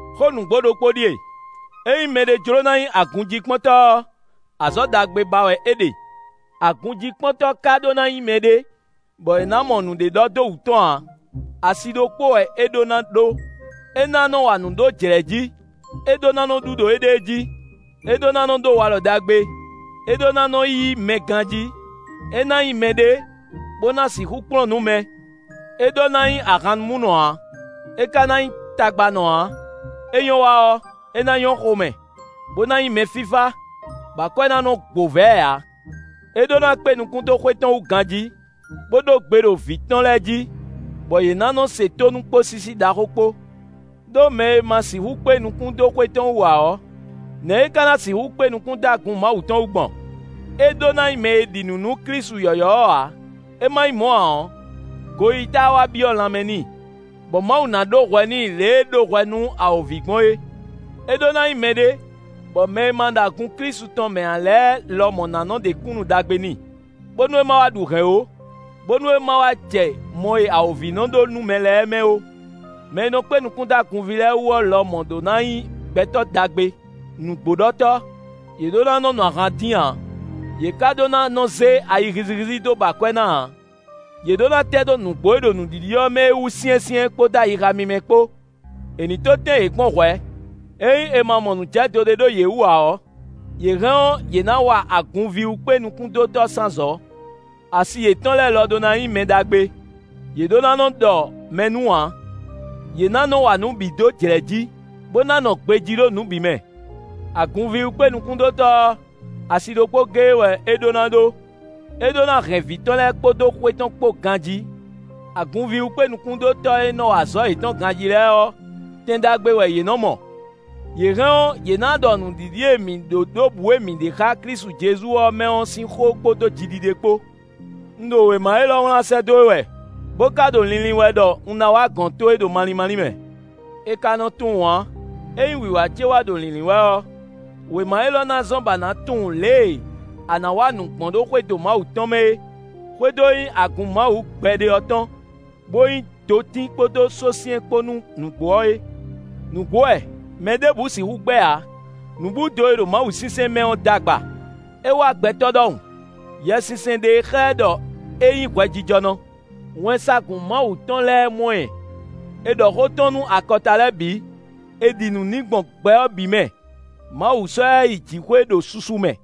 Xó nǔgbó ɖokpó ɖíe: ényí mɛɖé jló ná nyí agunjíkpɔ́ntɔ́ ɔ́, azɔ̌ ɖagbe ba wɛ é ɖe. Agunjíkpɔ́ntɔ́ ka ɖó ná nyí mɛɖé, bɔ è nǎ mɔ nǔɖé ɖɔ dó wú tɔn ǎ. Asi ɖokpó wɛ é ɖó ná ɖó; é ná nɔ wa nǔ ɖó jlɛ̌ jí; é ɖó ná nɔ ɖu ɖo éɖée jí; é ɖó ná ɖó walɔ ɖagbe; é ɖó ná nɔ yí mɛ ganjí; é ná nyí mɛɖé bó ná sixú kplɔ́n nǔ mɛ. É ɖó ná nyí ahannumúnɔ ǎ; é ka ná nyí tagbanɔ ǎ, é nyɔ́ wa ɔ́, é ná nyɔ́ xomɛ, bó ná nyí mɛfífá, bɔ akwɛ́ ná nɔ gbo vɛ̌ ɛ ǎ. É ɖó ná kpé nukún dó xwé tɔn wú ganjí, bó ɖó gbe ɖo vǐ tɔn lɛ́ɛ jí, bɔ yě ná nɔ́ se tónú kpó sísí ɖaxó kpó. Đó mɛ e ma sixú kpé nukún dó xwé tɔn wú ǎ ɔ́, nɛ̌ é ka ná sixú kpé nukún dó agun Mawu tɔn wú gbɔn? É ɖó ná nyí mɛ e ɖi nǔ nú Klísu yɔ̌yɔ́ ɔ́ ǎ; é ma nyí mɔ̌ ǎ ɔ́, goyíyí táá wá byɔ́ lanmɛ n'i, bɔ Mawu ná ɖó hwɛ n'i lě e é ɖó hwɛ nú awǒvi gbɔn é. É ɖó ná nyí mɛɖé bɔ mɛ e ma ɖo agun Klísu tɔn mɛ ǎ lɛ́ɛ lɔmɔ̌ ná nɔ ɖe kúnnu ɖagbe n'i, bónú é ma wá ɖu hɛ̌n ó, bónú é ma wá jɛ mɔ e awǒvi nɔ ɖó nú mɛ lɛ́ɛ mɛ ó. Mɛ e nɔ kpé nukún dó agunví lɛ́ɛ wú ɔ́ lɔmɔ̌ ɖó ná nyí gbɛtɔ́ ɖagbe, nǔgbóɖɔtɔ́; yě ɖó ná nɔ nu ahan dín ǎ; yě ka ɖó ná nɔ zé ayi hízíhízí dó ba akwɛ́ ná ǎ. Yě ɖó ná tɛ́ dó nǔgbó e ɖo nǔɖiɖi ɔ́ mɛ é wú syɛ́nsyɛ́n, kpódó ayixa mímɛ́ kpó. È nǐ tó tɛ́n yě kpɔ́n hwɛ̌; ényí è ma mɔ nǔ jɛ dó ɖé ɖo yě wú ǎ ɔ́, yě hɛn ɔ́, yě ná wa agunvíwú-kpénukúndótɔ́ sín azɔ̌. Asi yětɔn lɛ́ɛ lɔ ɖó ná nyí mɛ ɖagbe; yě ɖó ná nɔ ɖɔ mɛ nú ǎ; yě ná nɔ wa nǔ bǐ dó jlɛ̌ jí, bó ná nɔ gbejí ɖo nǔ bǐ mɛ. Agunvíwú-kpénukúndótɔ́ ɔ́, así ɖokpó géé wɛ é ɖó ná ɖó; é ɖó ná hɛn vǐ tɔn lɛ́ɛ kpódó xwé tɔn kpó ganjí. Agunvíwú-kpénukúndótɔ́ e nɔ wa azɔ̌ yětɔn ganjí lɛ́ɛ ɔ́, tɛn ɖagbe wɛ yě nɔ mɔ; yě hɛn ɔ́, yě ná ɖɔ nǔɖiɖi e mǐ ɖó ɖo bǔ e mǐ ɖe xá Klísu Jezu ɔ́ mɛ ɔ́ sín xó kpódó jiɖiɖe kpó. Un ɖo wěma élɔ́ wlán sɛ́ dó we wɛ, bó ka ɖo linlin wɛ ɖɔ un ná wá gɔ̌n towe ɖo malín málín mɛ. È ka nɔ tunwun ǎ; ényí wǐwá ce wá ɖo lǐnlín wɛ ɔ́, wěma élɔ́ ná zɔ́n bɔ a nǎ tunwun lě e a nǎ wa nǔ gbɔn ɖo xwédo Mawu tɔn mɛ é; xwédo e nyí agun Mawu gbɛɖe ɔ́ tɔn, bó nyí dotín kpódó sósyɛ́n kpó nú nǔgbó ɔ́ é. Nǔgbó wɛ, mɛ ɖěbǔ sixú gbɛ́ ǎ; nǔbúdo e ɖo mawusinsɛn mɛ ɔ́ d'agba. “É wá gbɛtɔ́ ɖɔhun; Yɛsinsɛn ɖe e xlɛ́ ɖɔ é nyí hwɛjijɔnɔ; wɛnsagun Mawu tɔn lɛ́ɛ mɔ ɛ. È ɖɔ xó tɔn nú akɔta lɛ́ɛ bǐ; è ɖi nǔ n'i gbɔn gbɛ ɔ́ bǐ mɛ; Mawu sɔ́ ɛ yi jǐxwé ɖo susu mɛ.”